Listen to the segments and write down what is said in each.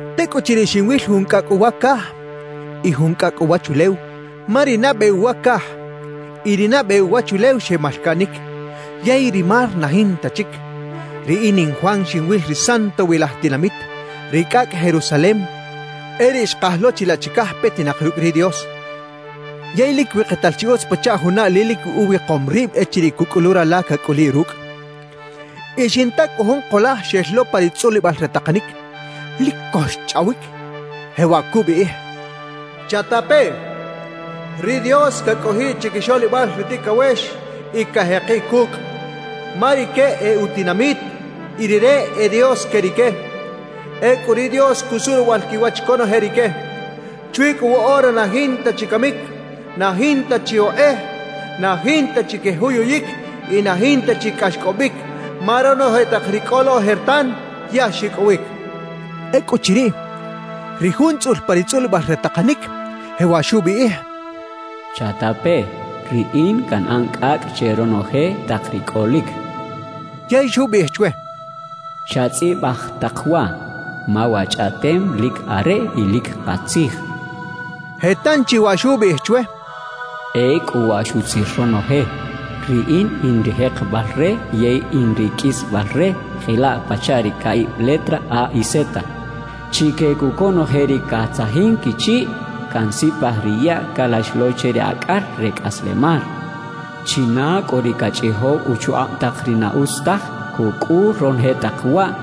Tecꞌuchiriꞌ xinwil jun cꞌacꞌ uwa caj y jun cꞌacꞌ uwachulew, ma ri nabe uwa caj y ri nabe uwachulew xemalcaꞌnic, yey ri mar na jinta chic. Riꞌin in Juan xinwil ri santowilaj tinamit, ri cꞌacꞌ Jerusalem, e riꞌ xkaj lo chilaꞌ chicaj petinak rucꞌ ri Dios, yey lic wikital chi utz pachaꞌ juna ali lic uwikom rib echiriꞌ cuꞌcꞌulu rala cacꞌuliꞌ rucꞌ. Y xinta cꞌu jun kulaj xel lo pa ri tzꞌulibal re takanic, lic co xchꞌawic, jewaꞌ cubiꞌij: «¡Chatapeꞌ! Ri Dios cacꞌojiꞌ chiquixoꞌlibal ri ticawex y cajekiꞌ cucꞌ; ma rique e utinamit, y Rire e Dios que rique. Ecꞌu ri Dios cusuꞌ ruwaꞌal quiwach conoje rique. Chwi cꞌu woꞌora na jinta chi camic, na jinta chi okꞌej, na jinta chi quejuyuyic y na jinta chi cꞌaxcꞌobic; ma ronoje tak ri cꞌo lo ojertan, ya xicꞌowic» cachaꞌ. Ecꞌuchiriꞌ, ri Jun tzꞌul pa ri tzꞌulibal re takanic, jewaꞌ xubiꞌij: «Chatapeꞌ: Riꞌin canꞌan cꞌacꞌ che ronoje tak ri cꞌolic» xchaꞌ. Yey xubiꞌij chwe: «Chatzꞌibaj tak waꞌ, ma wa chꞌaꞌtem lic areꞌ y lic katzij» xchaꞌ. Je tanchi waꞌ xubiꞌij chwe: «Ecꞌu waꞌ xutzir ronoje. Riꞌin in ri jekebal re yey in ri qꞌuisbal re, jelaꞌ pachaꞌ ri caꞌib letra A y Z. Chique cꞌu conoje ri catzajin quichiꞌ, cansipaj ri yaꞌ calax lo che ri acꞌal re cꞌaslemal. China cꞌu ri cachꞌijow uchukꞌab tak ri na utz taj, cucꞌul ronoje tak waꞌ,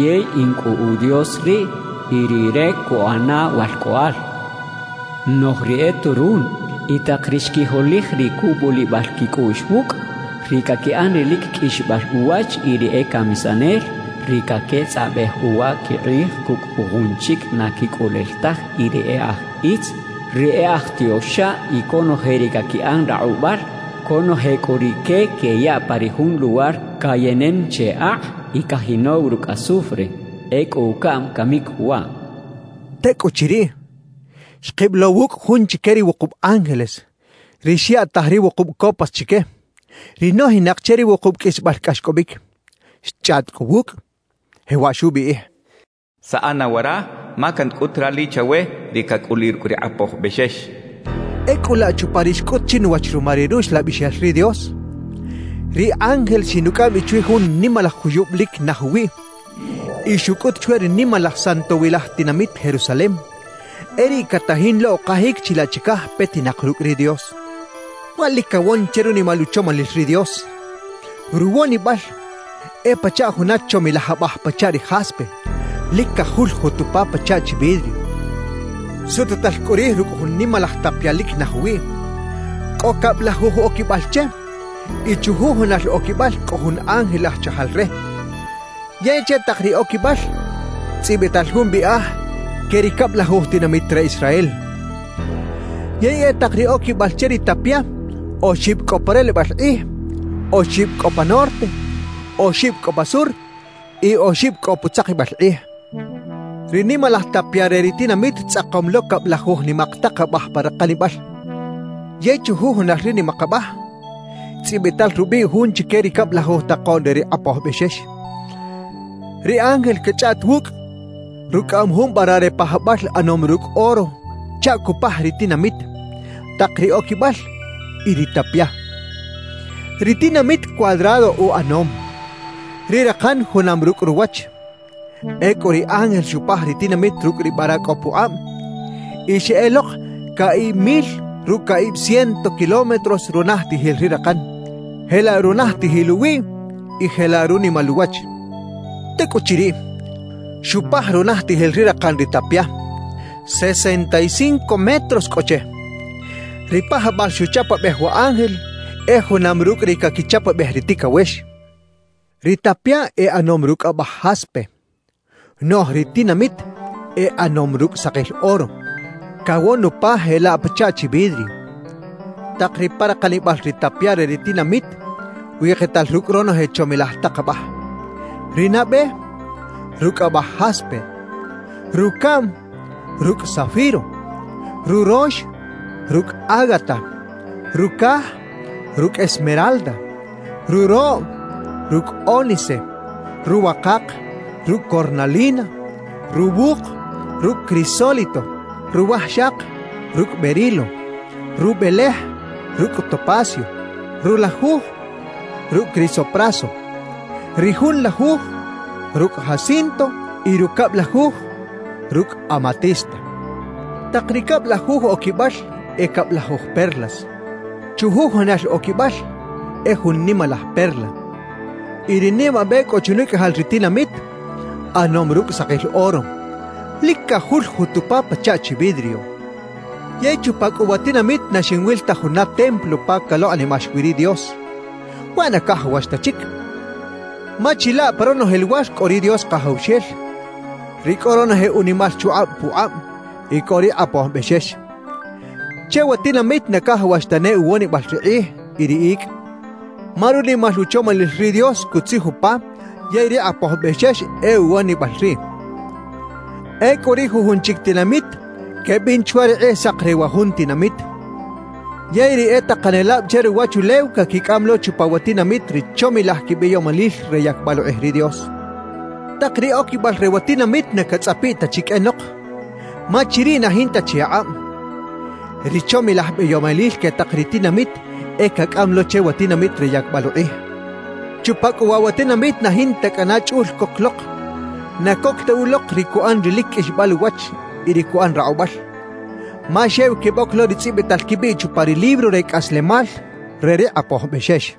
yey in cꞌu u Dios riꞌ, y rire cuꞌana walcꞌoꞌal. Noꞌj ri e turun, y tak ri xquijolij ri cubulibal quicꞌuꞌx wucꞌ, ri caquiꞌan ri lic qꞌuixbal uwach y ri e camisanel, ri caquetzꞌabej uwa quikꞌij cucꞌ jujun chic na quicꞌulel taj y ri e aj itz, ri e aj tioxab y conoje ri caquiꞌan rakꞌubal, conoje cꞌu rique queyaꞌ pa ri jun luwar cayenen che akꞌ y cajinow rucꞌ azufre. Ecꞌu ucaꞌm camic waꞌ» xchaꞌ. Tecꞌuchiriꞌ, xkib lo wucꞌ jun chique ri wukub ángeles, ri xyaꞌtaj ri wukub copas chique, ri nojinak che ri wukub qꞌuisbal cꞌaxcꞌobic. Xchꞌaꞌt cꞌu wucꞌ, jewaꞌ xubiꞌij: «Saꞌa na wara, ma cancꞌut rali chawe ri cacꞌuliꞌ rucꞌ ri Kꞌapoj Bexex» xchaꞌ. Ecꞌu laꞌ chupa ri xcꞌut chinuwach ruma ri Ruxlabixel ri Dios, ri ángel xinucꞌam bi chwi jun nimalaj juyub lic naj uwiꞌ y xucꞌut chwe ri nimalaj santowilaj tinamit Jerusalem, e riꞌ catajin lo ukajic chilaꞌ chicaj petinak rucꞌ ri Dios. Waꞌ lic cawon che runimal uchomalil ri Dios; ruwonibal e pachaꞌ juna chomilaj abaj pachaꞌ ri jaspe, lic cajuljut upa pachaꞌ chi vidrio. Sututal cꞌu rij rucꞌ jun nimalaj tapia lic naj uwiꞌ; cꞌo cablajuj oquibal che y chujujunal oquibal cꞌo jun ángel aj chajal re, yey che tak ri oquibal tzꞌibital jun biꞌaj que ri cablajuj tinamit re Israel. Yey e tak ri oquibal che ri tapia oxib cꞌo pa relebal kꞌij, oxib cꞌo pa norte, oxib cꞌo pa sur y oxib cꞌo putzakibal kꞌij. Ri nimalaj tapia re ri tinamit tzꞌakom lo cablajuj nimak tak abaj pa rakanibal; yey chujujunal ri nimak abaj, tzꞌibital rubiꞌ jun chique ri cablajuj takoꞌn re ri Kꞌapoj Bexex. Ri ángel cachꞌaꞌt wucꞌ rucꞌaꞌam jun vara re pajabal ꞌanom rucꞌ oro chaꞌ cupaj ri tinamit, tak ri oquibal y ri tapia. Ri tinamit cuadrado uꞌanom; ri rakan junam rucꞌ ruwach. Ecꞌu ri ángel xupaj ri tinamit rucꞌ ri vara cꞌo pukꞌab. Y xeꞌelok caꞌib mil rucꞌ caꞌib ciento kilómetros runajtijil ri rakan, jelaꞌ runajtijil uwiꞌ, y jelaꞌ runimal uwach. Tecꞌuchiriꞌ, xupaj runajtijil ri rakan ri tapia; sesenta y cinco metros cꞌo che. Ri pajabal xuchapabej wa ángel e junam rucꞌ ri caquichapabej ri ticawex. Ri tapia e ꞌanom rucꞌ abaj jaspe; noꞌj ri tinamit e ꞌanom rucꞌ sakil oro, cawon upa jelaꞌ pachaꞌ chi vidrio. Tak ri pa rakanibal ri tapia re ri tinamit wikital rucꞌ ronoje chomilaj tak abaj. Ri nabe, rucꞌ abaj jaspe; rucaꞌm, rucꞌ zafiro; rurox, rucꞌ ágata; rucaj, rucꞌ esmeralda; ruroꞌ, rucꞌ ónice; ruwakak, rucꞌ cornalina; ruwuk, rucꞌ crisólito; ruwajxak, rucꞌ berilo; rubelej, rucꞌ topacio; rulajuj, rucꞌ crisopraso; ri junlajuj, rucꞌ jacinto y rucablajuj, rucꞌ amatista. Tak ri cablajuj oquibal e cablajuj perlas; chujujunal oquibal e jun nimalaj perla. Y ri nimabe cꞌo chunicꞌajal ri tinamit ꞌanom rucꞌ sakil oro, lic cajuljut upa pachaꞌ chi vidrio. Yey chupa cꞌu wa tinamit na xinwil ta juna templo pa calokꞌnimax wi ri Dios; waꞌ na cajawax ta chic, ma chilaꞌ pa ronoje luwar cꞌo ri Dios Kajawxel, ri cꞌo ronoje unimal chukꞌab pukꞌab, y cꞌo ri Kꞌapoj Bexex. Che wa tinamit na cajawax tane uwonibal ri kꞌij y ri icꞌ, ma runimal uchomalil ri Dios cutzij upa yey ri Kꞌapoj Bexex e uwonibal riꞌ. Ecꞌu ri jujun chic tinamit quebin chwa ri kꞌijsak re wa jun tinamit; yey ri e takanelab che ruwachulew caquicꞌam lo chupa wa tinamit ri chomilaj quibeyomalil re yacbal ukꞌij ri Dios. Tak ri oquibal re wa tinamit na catzꞌapiꞌ ta chi qꞌuenok, ma chiriꞌ na jinta chi akꞌab. Ri chomilaj beyomalil que tak ri tinamit e cacꞌam lo che wa tinamit re yacbal ukꞌij. Chupa cꞌu waꞌ wa tinamit na jinta cꞌana chꞌul coc lok, na coc ta ulok ri cuꞌan ri lic qꞌuixbal uwach y ri cuꞌan rakꞌubal; ma xew queboc lo ri tzꞌibital quibiꞌ chupa ri libro re cꞌaslemal re ri Kꞌapoj Bexex.